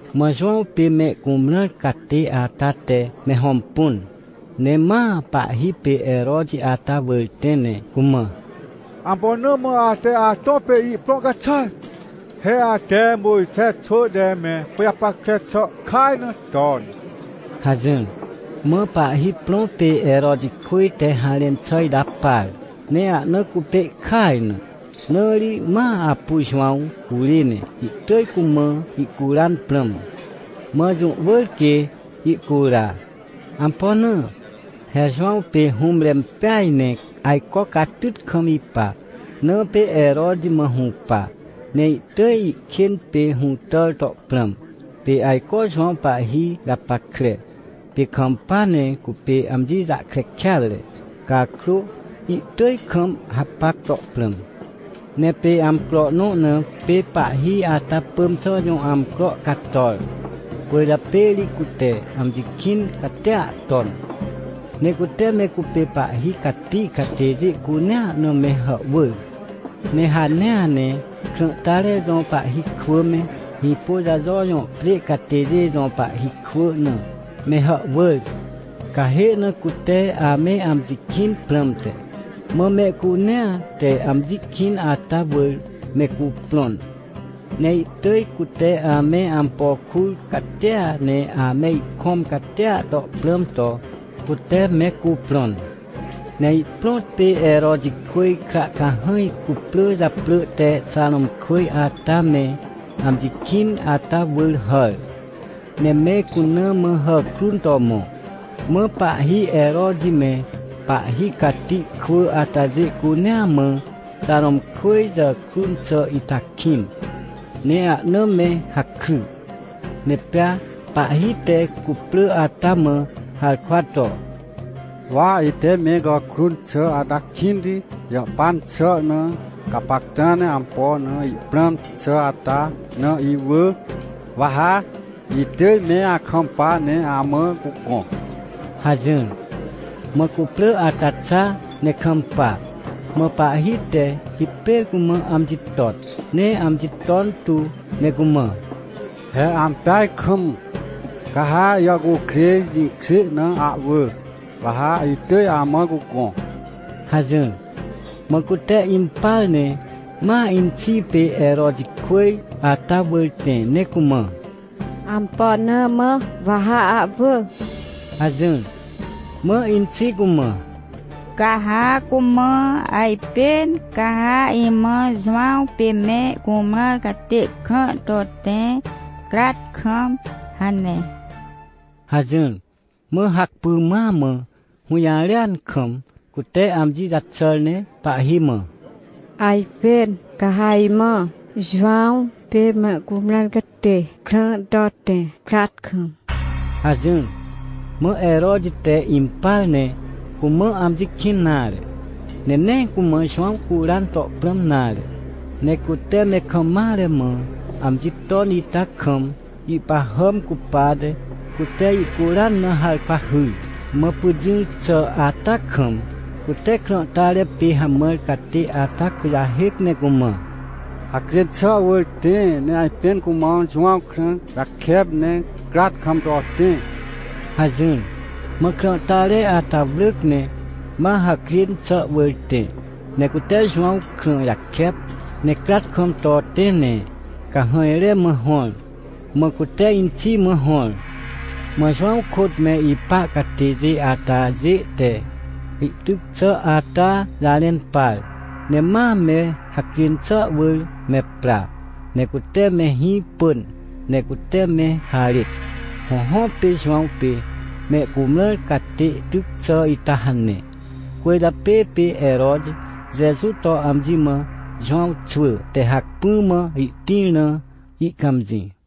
Mã Jowãw pê me cumrãr catê ata te me hõmpun, ne ma pahhi pê Heroti ata wỳr tẽ ne cumã: — Ampo na mã ate atõ pê ihprõ caxàr? He ate Mojxe xwỳ te me pajapackre xà kaj na ton — hajỹr. Mã pahhi prõ pê Herotijkwỳj te harẽn xà ita par, ne ahna cupê ihkaj na. Na ri ma apu Jowãw curê ne ihtỳj cumã ihcuran prãm. Mã jũ wỳr quê ihcura. Ampo na? He Jowãw pê hũmre impeaj ne ajco catyt kam ipa, na pê Heroti mã hũpa, ne ihtỳj ihkên pê hũtàr to prãm. Pê ajco Jowãw pahhi japackre, pê kampa ne cupê amji jahkre kêatre cakrô, ihtỳj kam hapac to prãm. Ne pê amcro nõ na pê pahhi ata pỳm xà jõ amcro cator, cwỳrjapê ri cute amji kĩn catia ton, ne cute me cupê pahhi cati catêjê cunea na me hàhwỳr. Ne hanea ne krãhtare jõ pahhi kwỳ me, Hĩpôjajo jõ pjê catêjê jõ pahhi kwỳ na me hàhwỳr, cahê na cute ame amji kĩn prãmte. Mã mehcunea te amji kĩn ata wỳr mehcuprõn, ne ihtỳj cute ame ampo kur catia ne ame ikõm catia to prãm to, cute mehcuprõn. Ne ihprõtpê Herotijkwỳj kra cahãj cuprỳ japrỳ te Xarõmkwỳj ata me amji kĩn ata wỳr hàr, ne me cuna mã hàkrun to mõ. Mã pahhi Heroti me pahhi cati kwỳ atajê cunea mã Xarõmkwỳj jàkrun xà ita kĩn, ne ahna me hakry. Ne pea pahhi te cuprỳ ata mã harkwa to: — Wa ite me gàkrun xà ata kĩnti jahpan xà na, gapacta ne ampo na ihprãm xà ata na iwỳ, wa ha itỳj me akampa ne amã cugõ — hajỹr. Mã cuprỳ ata xa ne kampa. Mã pahhi te hipêr cumã amji ton ne amji ton tu ne cumã: — He ampeaj kam! Ca ha ijàhcukrêj jĩkjê na ahwỳ, wa ha itỳj amã cugõ! — hajỹr. Mã cute impar ne ma inxi pê Herotijkwỳj ata wỳr tẽ ne cumã: — Ampo na mã wa ha ahwỳ? — hajỹr. Mã inxi cumã: — Ca ha cumã: “Ajpên ca ha imã Jowãw pê me cumrãr catê krã to tẽ, crat kam” hane — hajỹr. Mã hacpỹ ma mã hũjarêan kam, cute amji jaxàr ne pahhi mã: — Ajpên ca ha imã Jowãw pê me cumrãr catê krã to tẽ, crat kam — hajỹr. Mã Heroti te impar ne cumã amji kĩn nare, ne nee cumã Jowãw curan to prãm nare. Ne cute me kam mare mã amji ton ita kam, ihpahàm cupate, cute ihcuran na harkwa hyr. Mã pyt jỹr xà ata kam, cute krãhtare pê hamãr catê ata kujahêc ne cumã: — Hacjên xà wỳr tẽ ne ajpên cumã Jowãw krã jakep, ne crat kam to tẽ — hajỹr. Mã krãhtare ata wrỳc ne ma hacjên xà wỳr tẽ, ne cute Jowãw krã jakep, ne crat kam to tẽ ne cahãjre mã hõr. Mã cute inxi mã hõr. Mã Jowãw kôt me ipa catêjê atajê te ihtyc xà ata jarẽn par, ne ma me hacjên xà wỳr me pra, ne cute me hĩ pỳn ne cute me harêt. Hõhõ, pê Jowãw pê me cumrãr catê tyc xà ita hane. Cwỳrjapê pê Heroti Jeju to amji mã Jowãw xwỳ te hacpỹ mã ihtĩr na ihcãmjĩ.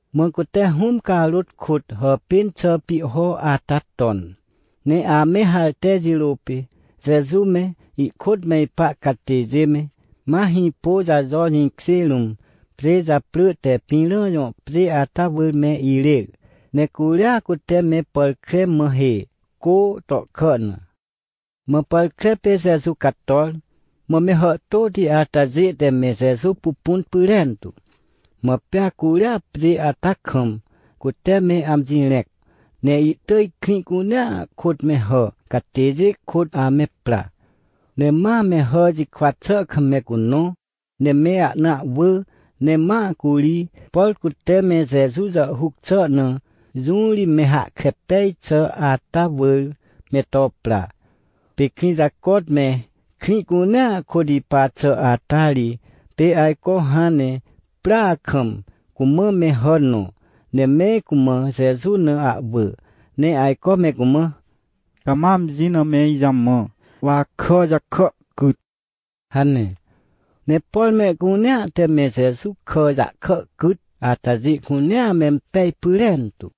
Mã cute Hũm carôt kôt hàpên xà pihho ata ton, ne ame harte jirô pê Jeju me, ihkôt me ipa catêjê me, ma Hĩpôjajo jĩkjê rũm, pjê japrỳ te Pĩrã jõ pjê ata wỳr me irêr, ne curia cute me pàr kre mã hê, cô tohkà na. Mã pàr kre pê Jeju cator, mã me hàhtôti atajê te me Jeju pupun pyrentu. Mã pea curia pjê ata kam cute me amji rẽc, ne ihtỳj krĩ cunea kôt me hà catêjê kôt ame pra. Ne ma me hà jikwa xà kam me cunõ, ne me ahna ahwỳ ne ma curi, por cute me Jeju jàhhuc xà na, jũ ri me hahkre pej xà ata wỳr me to pra. Pê krĩ jacot me krĩ cunea kôt ipa xà ata ri pê ajco hãn ne prya kam, cumã me hà nõ, ne me cumã Jeju na ahwỳ, ne ajco me cumã: — Cama amji na me ijamã, wa akà jahkà cyt — hane. Ne por mehcunea te me Jeju kà jahkà cyt atajê cunea mempej pyrentu.